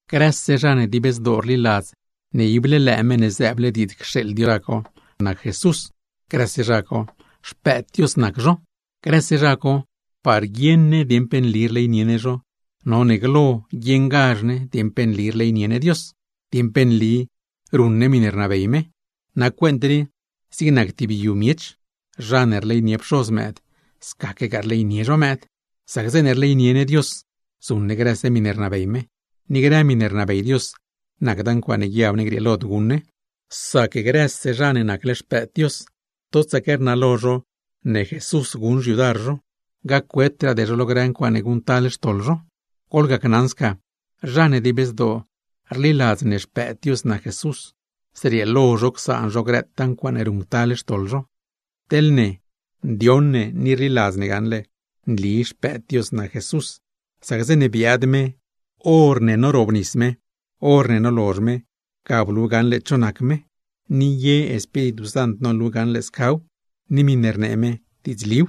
Grëse zha ne dib zdoo rliladz ne ible lëë Meṉ ne zëëble diidz cxeeḻ Dios lo guidzliu ga nac Jesús, grëse zha co xpëëd Dios nac zho. Grëse zha co, par guieṉ ne dieṉ pe nli rleynie ne zho, none guieṉ ne dieṉ pe nli rleynie ne Dios, dieṉ pe nli ruṉ ne miṉe rnabey me. Nac cuent rii, zig nac tib yu miech, zha ne rleynie pxoz mëëd, scaquegaa rleynie zho mëëd. Sac zeeṉe rleynie ne Dios, zuṉ ne grëse miṉe rnabey me. Ni grë miṉe rnabey Dios, nacda ncuaaṉe guiab ne grieelod guṉ ne; sac grëse zha ne nacle xpëëd Dios, totsaque rnalo zho ne Jesús guṉ xyudar zho, gac-wetraade zho lo grë ncuaaṉe guṉctal xtoḻ zho. Goḻgacnaṉ sca: zha ne dib zdoo rliladz Xpëëd Dios nac Jesús, zrieelo zho csaan zho grëtaa ncuaaṉe ruṉctal xtoḻ zho. Teḻ ne, ndioṉ ne ni rliladz ne gaṉle nli Xpëëd Dios nac Jesús, sac zeeṉe biaad me horne norobnis me, horne nolozh me, ga blu gaṉle cho nac me. Ni ye Espíritu Sant nolu gaṉle ne scaw, ni miṉe rnee me diidzliw.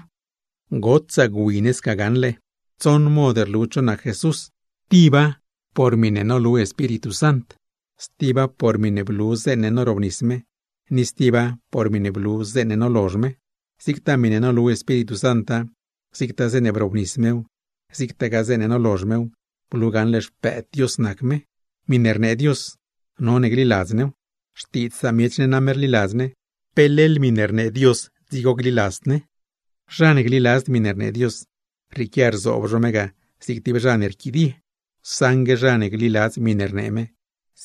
Gotsaa gwi sca gaṉle, tsoṉ mod rlu cho nac Jesús: Tiba por miṉe nolu Espíritu Sant, stiba por miṉe blu zeeṉe norobnis me, ni stiba por miṉe blu zeeṉe nolozh me. Zigtaa miṉe nolu Espíritu Santa, zigtaa zeeṉe brobnis mew, zigtagaa zeeṉe nolozh mew, blu gaṉle Xpëëd Dios nac me. Miṉe rnee Dios, none gliladz new. Xtiidz samiech ne name rliladz ne, ¿pe leḻ miṉe rnee Dios dzigo gliladzd ne? Zha ne gliladzd miṉe rnee Dios, rrieequia rzoob zho me ga zig tib zha ne rquidie; saṉgue zha ne gliladz miṉe rnee me,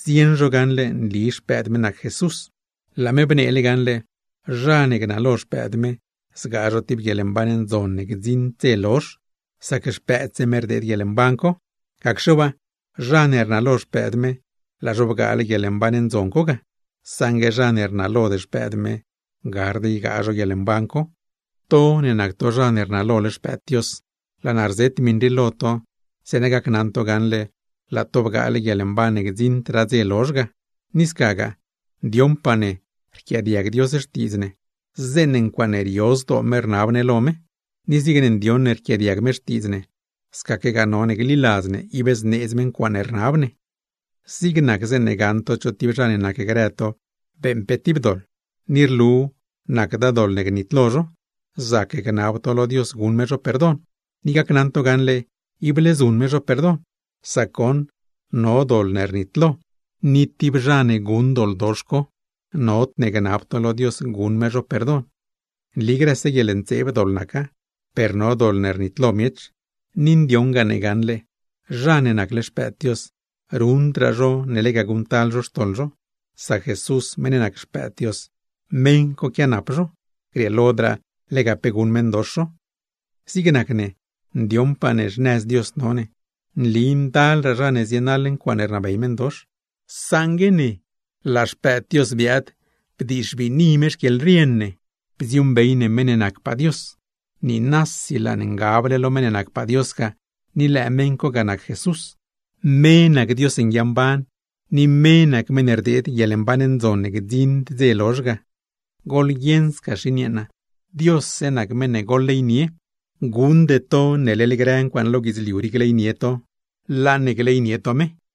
zieṉ zho gaṉle nli Xpëëd me nac Jesús. Laa me bneele gaṉle: zha ne gnalo Xpëëd me, zgaa zho tib guieḻmban ndzon ne gdziṉd dze lozh; sac Xpëëdse me rdeed guieḻmban co. Gacxe waa, zha ne rnalo Xpëëd me, laa zho bgaale guieḻmban ndzon co; saṉgue zha ne rnalod Xpëëd me, gard ygaa zhow. To ne nac to zha ne rnalole Xpëëd Dios, laa naa rzet miṉ rii lo to zeeṉa gacnaṉ to gaṉle laa to bgaale guieḻmban ne gdziṉdraa dze lozh ga. Ni scagaa, ndioṉpaa ne rquiaadiag Dios xtiidz ne, zeeṉe ncuaaṉe rio zdoo me rnab ne lo me; ni zigne ndioṉ ne rquiaadiag me xtiidz ne, scaquegaa none gliladz ne ib zneedz me ncuaaṉe rnab ne. Zig nac zeeṉe gaṉ to cho tib zha ne nacgrë to beeṉ pe tib doḻ, ni rlu nacda doḻ ne gnitlo zho, zac gnab to lo Dios guṉ me zho perdon; ni gacnaṉ to gaṉle, ible zuṉ me zho perdon. Sac goṉ no doḻ ne rnitlo, ni zha ne guṉ doḻ co, nodne gnab to lo Dios guṉ me zho perdon. Nli grëse guieḻntseeb doḻ naca, per no miṉe rnitlod miech. Ni ndioṉ ne gaṉle, zha ne nacle xpëëd Dios ruṉdraa zho ne lega guṉctal zho xtoḻ zho; sac Jesús meṉ ne nac Xpëëd Dios, meṉ co quianap zho, grieelodraa lega pe guṉ meṉdox zho. Zig nac ne, ndioṉpaa ne xnëz Dios no ne. Nli ndalraa zha ne zienaḻ ncuaaṉe rnabey meṉdox, saṉgue ne, laa Xpëëd Dios biaad bdixbiini me xquieḻrien ne bdziuuṉbey ne meṉ ne nacpaa Dios. Niinasi laa ne ngable lo meṉ ne nacpaa Dios ga, ni lëë me ga nac Jesús. Me nac Dios nguiamban, ni me nac meṉ ne rdeed guieḻmban ndzon ne gdziṉd dze lozh. Xin yeeṉa, goḻguieṉ Diosse nac meṉ ne gleynie to; guṉde to ne leḻ grë ncuaaṉe no lo guidzliu rii gleynie to, laa ne gleynie to Dios. Juan